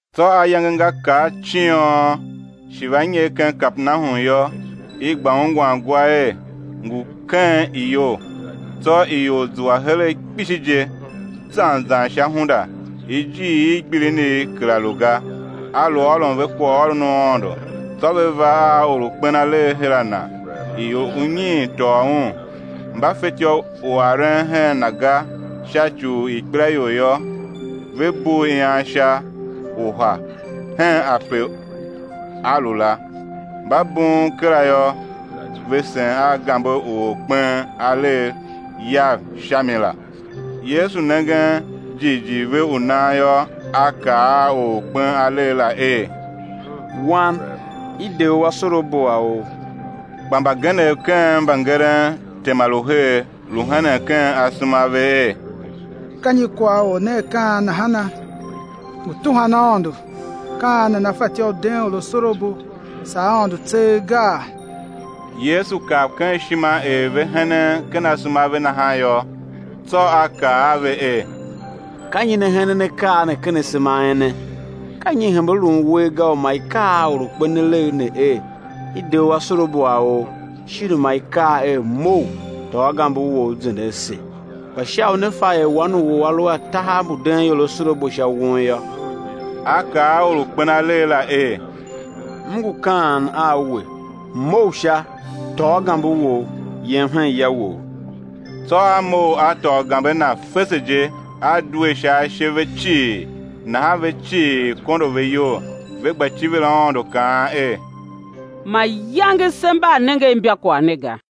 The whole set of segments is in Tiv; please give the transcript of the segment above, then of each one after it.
Tsô ayange nga kar ciôn, shi va nyer ken Kapernahum yô, i gba ungwan gwa er, ngu ken iyou. Tsô ior zua heregh kpishi je, zan zan sha hunda ijiir i gbilinigh kera lu ga. A lu ôron ve kwaghôron u Aôndo. Tsô ve va a or u kpen alegh her a Na, ior unyiin tôô un. Mba fetyô u aren hen Na ga sha ci u ikpelaior yô, ve bugh ian sha uha henpe A lu la; mba bughun kera yô, ve sen a gambe u or u kpen alegh yav sha mi la. Yesu nengen jighjigh ve u nan yô, A kaa a or u kpen alegh la er: Wan, i de u asorabo a ou. Kpa mbagenev ken mbangeren tema lu her, lu henen ken asema a ve er: Ka nyi kwagh Or ne A kaan nahana? Ngu tuhwan Aôndo. Ka an nana fatyô u den or asorabo saa Aôndo tseegh gaa? Yesu kav ken ishima er ve henen ken asema a ve nahan yô; tsô A kaa a ve er: Ka nyi ne henen akaa ne ken asema a ene? Ka nyi i hembe lun uwer ga, u ma i kaa a or u kpen alegh ne er: I de u asorabo a ou; shin u ma i kaa er: Mough, tôô gambe wou, zende ase? Kpa sha u ne fa er Wan u or A lu a tahav mbu den ior asorabo sha won yô, A kaa a or u kpen alegh la er: M ngu kaan a we, mough sha, tôô gambe wou, yem hen ya wou. Tsô a mough, a tôô gambe na fese je, a due sha ashe ve cii; nahan ve cii, kondo ve iyol, ve gba civir Aôndo kaan er: Mayange se mba a nenge imbakwagh ne ga.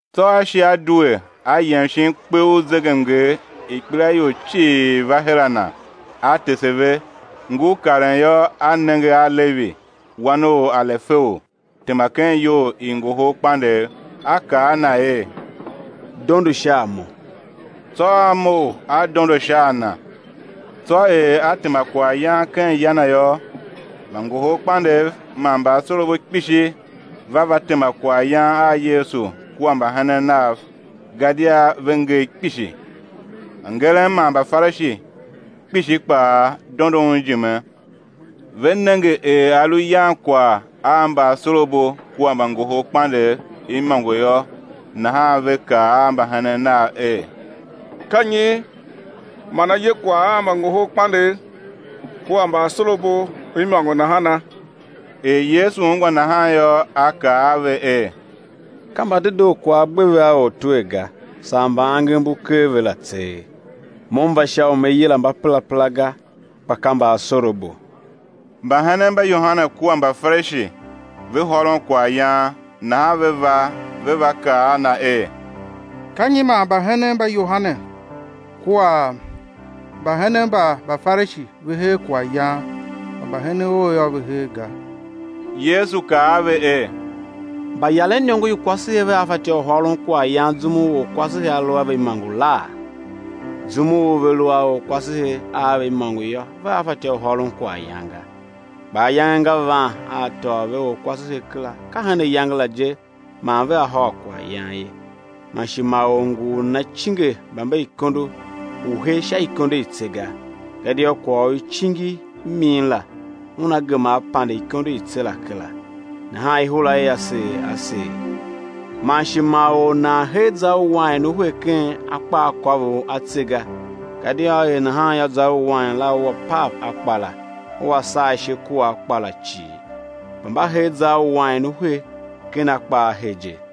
Tsô A shi a due, A yem shin kpe u zegemnger, ikpelaior cii va her a Na, A tese ve. Ngur karen yô, a nenge a Levi wan u Alefeu, tema ken iyou i ngohol kpandegh, A kaa a na er: Dondo sha a Mo. Tsô a mough a dondo sha a Na. Tsô er A tema kwaghyan ken ya na yô, mbangoholkpandegh man mbaasorabo kpishi va va tema kwaghyan a Yesu kua mbahenen Nav, gadia ve ngee kpishi. Mbangeren man Mbafarishi kpishi kpaa dondo Un ijime, ve nenge er A lu yan kwagh a mbaasorabo kua mbangoholkpandegh imôngo yô, nahan ve kaa a mbahenen nav er: Ka nyi man A ye kwagh a mbangoholkpandegh kua mbaasorabo imôngo nahana? Er Yesu ungwa nahan yô, A kaa a ve er: Ka mbadedoo kwagh a gbe ve a ortwer ga, saa mba angev mbu ker ve la tseegh. Mo M va sha u Me yila mbaperapera ga, kpa ka mbaasorabo. Mbahenen mba Yohane kua Mbafarishi ve hôron kwaghyan; nahan ve va, ve va kaa a Na er: Ka nyi man mbahenen mba Yohane kua mbahenen mba Mbafarishi ve her kwaghyan, kpa mbahenen Ou yô, ve her ga? Yesu kaa a ve er: Mbayaren iniongo i kwasehe vea fatyô u hôron kwaghyan zum u orkwasehe a lu a ve imôngo laa? Zum u ve lu a orkwasehe a ve imôngo yô, vea fatyô u hôron kwaghyan ga. Kpa ayange nga van a á tôô ve orkwasehe kera, ka hen ayange la je man vea hôr kwaghyan ye. Man shi ma or ngu u nana cinge bamberikondo u he sha ikondo i tse ga, gadia kwagh u i cingi i min la una gema á pande ikondo i tse la kera, nahan ihura ia seer a seer. Man shi ma or nan hee zar u wain u he ken akpaakôvough a tse ga, gadia á er nahan yô, zar u wain la ua pav akpa la, ua saa ishe kua akpa la cii; kpa mba hee zar u wain u he ken akpa a he je.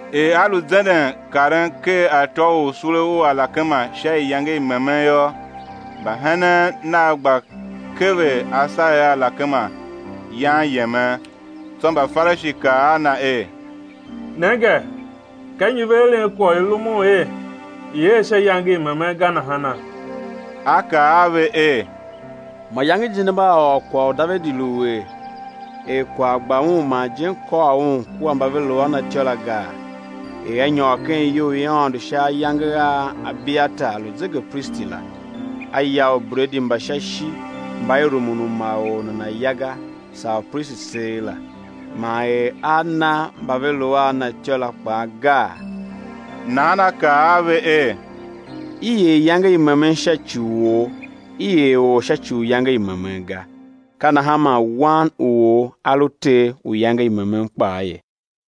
Er A lu zenden karen ker atô u sule u alakema sha iyange i memen yô, mbahenen Nav gba kever asagher a alakema yan yemen. Tsô Mbafarishi kaa a Na er: Nenge, ka nyi ve eren kwagh u i rumun er i̱ er sha iyange i memen ga nahana? A kaa a ve er: Mayange je ne mba a ôr kwagh u Davidi lu er, er kwagh gba un, man ijen kôr un kua mba ve lu a Na imôngo la gaa, er a nyôr ken iyou i Aôndo sha ayange a Abiyatar lu zegepristi la, a ya ubredi mba sha ishi, mba i rumun u ma or nana̱ ya ga, saa upristi tseegh la, man er a na mba ve lu a na ityô la kpaa gaa? Nahan A kaa a ve er: I er iyange i memen sha ci u or, i er or sha ci u iyange i memen ga. Ka nahan man Wan u or A lu Ter u iyange i memen kpaa ye.